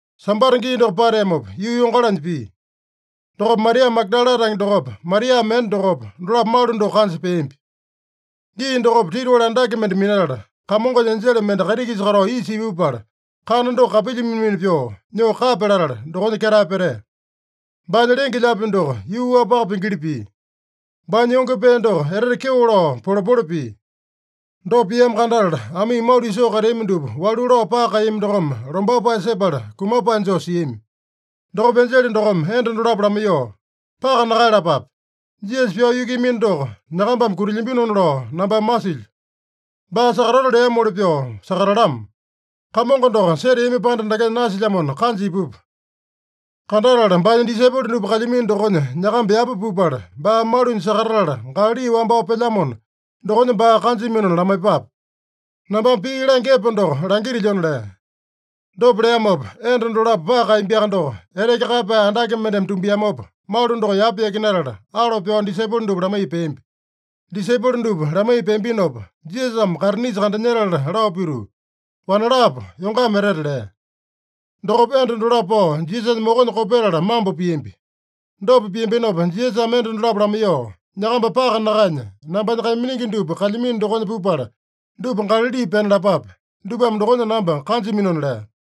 Sambata gii doko pateamopa, yuu yongalanya pia. Dokopa Maria Magadala tange dokopa, Maria mende dokopa, dolapo malu doko kanja peambi. Gii dokopa titiwali andake mende minatala, Kamongonya enjele mende kaiti-kisa katao isa ipupala, kana doko kapilya mina-mina pyoo nyoo kapya latala, dokonya ketae petea. Baanya lenge-lyaapi doko yuu-wapaka pingili pia. Baanya yonge pee doko etete kyeo lao polepole pia. Dopa piamo kandatala, amii malu isoo kateami dupa walu lao paka kaeyami dokome, lombapae sepala kumapae joo siami. Dokopa enjele dokome enda dolapo lamaiyoo, “Paka nakaeyalapape. Jisasa pyao yukuiyamino doko nyakambame kutilyambinona lao nambame masilyo. Baa sakatato leamoli pyoo sakatatalamo. Kamongo doko seteamino panda dakenya nasilyamona, kanja ipupa. Kandatala baanya disaipolo dupa kalyamino dokonya nyakamba yapa pupala, baa malunya sakatatala Galali wambao pelyamona, dokonya baa kanjaminona lamaiyepape. Nambame pii langya epo doko langitilyona” lea. Dopa leamopa enda dolapo paka kaeyambiaka doko, eteke kaeyapae andake mendeme tumbiamopa, malu doko yapa yakinatala, alo pyao disaipolo dupa lamaiya peambi. Disaipolo dupa lamaiya peambinopa, Jisasame kaitinisa kandanyetala lao pituu, “Wanalapo, yongama etete!” lea. Dokopa enda dolapo pao Jisasanya mokonya kopetala mambo piambi. Dopa piambinopa Jisasame enda dolapo lamaiyoo, “Nyakamba paka nakaenya, nambanya kaiminingi dupa kalyamino dokonya pupala, dupa Galali pena lapape. Dupame dokonya namba kanjaminona” lea.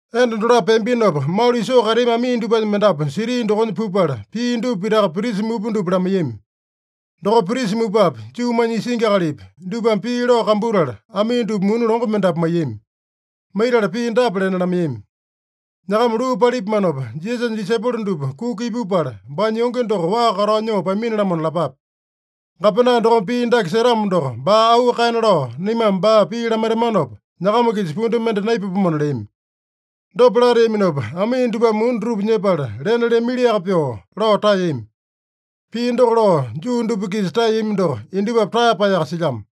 Enda dolapo peambinopa, malu isoo kateami amii dupanya mendapu siti dokonya pupala, pia dupa pitaka prisa mupa dupa lamaiyami. Dokopa prisa mupapi, Juumanya isingi akalipi, dupame pii lao kambutala, amii dupa muni longo mendapu maiyami. Maitala pii dapa lena lamaiyami: “Nyakama luu palipamanopa, Jisasanya disaipolo dupa kuka ipupala, baanya yonge doko waa katao nyoo pamini-lamona lapape. Gapena dokome pii dake setamo doko, baa auu kaena lao naimame baa pii lamaitamanopa, nyakama-kisa pundu mende naipapomona” leami. Dopa lateaminopa, amii dupame muni dutupa nyepala, lena leamiliaka pyoo lao taeyami. Pii doko lao Juu dupa-kisa taeyami doko, indupapi taeyapaeyaka silyamo.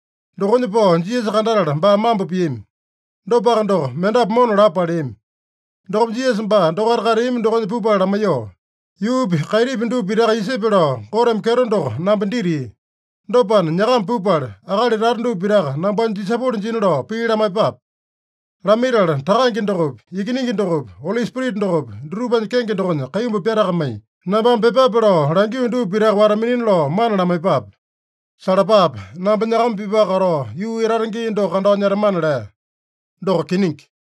Dokonya pao Jisasa kandatala, baa mambo piami. Dopaka doko, mendapu mona lapo paleami. Dokopa Jisasa baa dokaita kateami dokonya pupala lamaiyoo, “Yuupi, kaitipi dupa pitaka isepe lao Goteme kyeto doko namba ditia. Dopana, nyakama pupala, akali tata dupa pitaka nambanya disaipolo jina lao pii lamaiyepape. Lamaitala, Takange dokopi, Ikiningi dokopi, Oli Spirita dokopi, dutupanya kenge dokonya kaimbu pyatakamai, nambame pyepape lao langio dupa pitaka wata-minina lao mana lamaiyepape. Salapape! Namba nyakama-pipaka katao, yuu etata gii doko kandao nyetamana” lea. Doko kiningi.